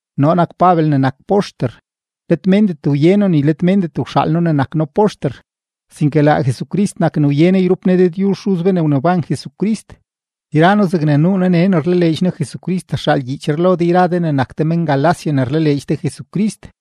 Noo nak Pabel ne nak poxter; let méndet wye noo ni let méndet wxaal noo ne nak noo poxter, sinke laa Jesucrist nak ne wye noo yrup Ne Dëdyuzh Xuz be ne wneban Jesucrist. Yra noo zegne nuu noo nee ne rlaleedx noo Jesucrist rxaal gyiichree lo de yra de ne nak de men-Galacia ne rlaleedx de Jesucrist.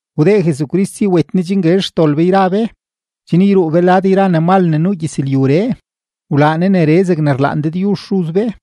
Wdee Jesucrist si wet Ne chen guezh xdol be yra be, chen yruu be lad yra ne mal ne nuu gyëzlyuree, wlaa Ne neree zegne rlaan Dëdyuzh Xuz be.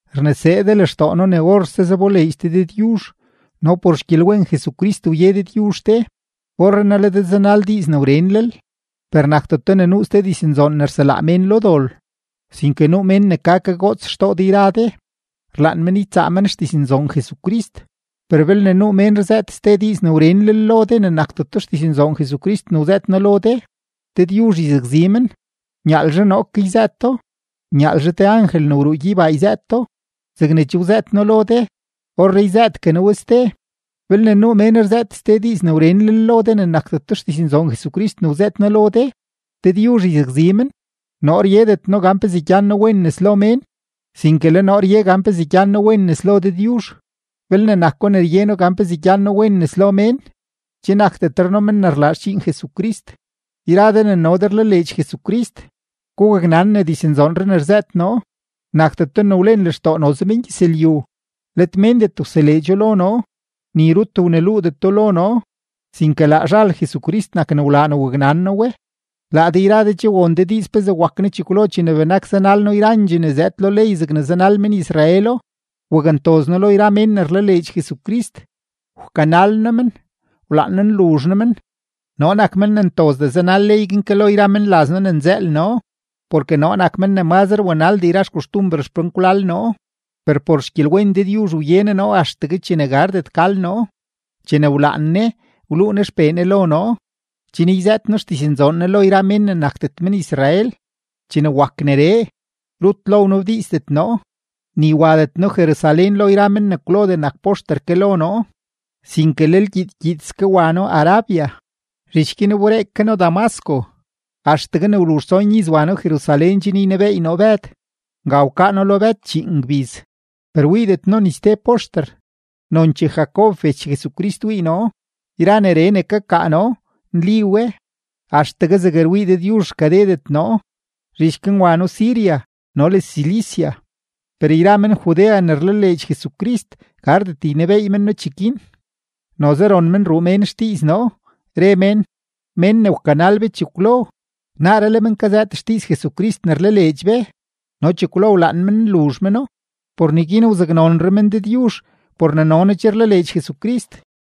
Rnesee de lextoo noo ne orse zaboleedx de Dëdyuzh no por xgyelwen Jesucrist wye Dëdyuzh de, orrenaa le de zanal ste diiz ne wrenlel, per nakdeto ne nuu ste diznzoon ne rselaa mén lo dol, sinke nuu mén ne ka kagoots xtoo de yra de, rlaan men ytsaa men xdiznzoon Jesucrist. Per belne nuu mén rzëët ste diiz ne wrenlel lo de ne nakdeto xdiznzoon Jesucrist ne wzëët noo lo de, Dëdyuzh yzakzi men, nyaalzhe noo ke yzëëto, nyaalzhe te angel ne wruu gyeybaa yzëëto. Zegne che wzëët noo lo de, orree yzëëtgue noo we ste: Belne nuu mén rzëët ste diiz ne wrenlel lo de ne nakdeto xdiznzoon Jesucrist ne wzëët noo lo de, Dëdyuzh yzakzi men. Noo ryedet noo gan pezee gyan noo wen nes lo mén, sinke le noo rye gan pezee gyan noo wen nes lo Dëdyuzh; belne nako ne rye noo gan pezee gyan noo wen nes lo mén, che nakdetre noo men ne rlaa xdxiin Jesucrist. Yra de ne no de rlaleedx Jesucrist, gugaknan ne diznzoonree ne rzëët noo, nakdeto ne wlen lextoo noze mengyëzlyu, let méndet wseleedxo lo noo, ni rut wneluudeto lo noo, sinke laa zhal Jesucrist nak ne wlaa ne waknan noo we. Laa de yra de che won de diiz pezee wak noo chekwlo chene benak zanal noo yrandxee ne zëëd lo ley zegne zanal men-Israelo. Wakntoz noo lo yra mén ne rlaleedx Jesucrist, wkanal noo men, wlaan noo nluzh noo men. Noo nak men ne ntozdee wanal ley guin ke lo yra menlaz noo ne nzëël noo, porke noo nak men ne mazre wanaldee yra xkoxtumber xpenkwlal noo. Per por xgyelwen Dëdyuzh wye Ne noo axtegue chene gardet gal noo. Chene wlaan Ne, wluu Ne XPee Ne lo noo, chen yzëët noo xdiznzoon Ne lo yra mén ne nakdet men-Israel. Chene wak neree, rut lo wnabdiizdet noo, ni wadet noo Jerusalén lo yra men ne kwlodee nak poxter ke lo noo, sinke lel gyiid gyiidske wa noo Arabia, zhich guin wberee ke noo Damasco. Axtegue ne wluzh tson iz wa noo Jerusalén chen ynebeey noo Bëd, nga wkaa noo lo Bëd chíín gbiz. Per wiidet noo ni ste poxter, nonchee Jacob bech Jesucrist wii noo. Yra neree ne kakaa noo, nli we, axtegue zeg rwii Dëdyuzh rkadedet noo. Zhich guin wa noo Siria no le Cilicia. Per yra men-Judea ne rlaleedx Jesucrist, gardet ynebeey men noo cheguin, noze ron men ruu mén xdiiz noo, re mén: “Mén ne wkanal be chekwlo, naaree le men kazëët xdiiz Jesucrist ne rlaleedx be no chekwlo wlaan men nluzh meno.” Por neguin wzaknonre men Dëdyuzh por ne no noo che rlaleedx Jesucrist.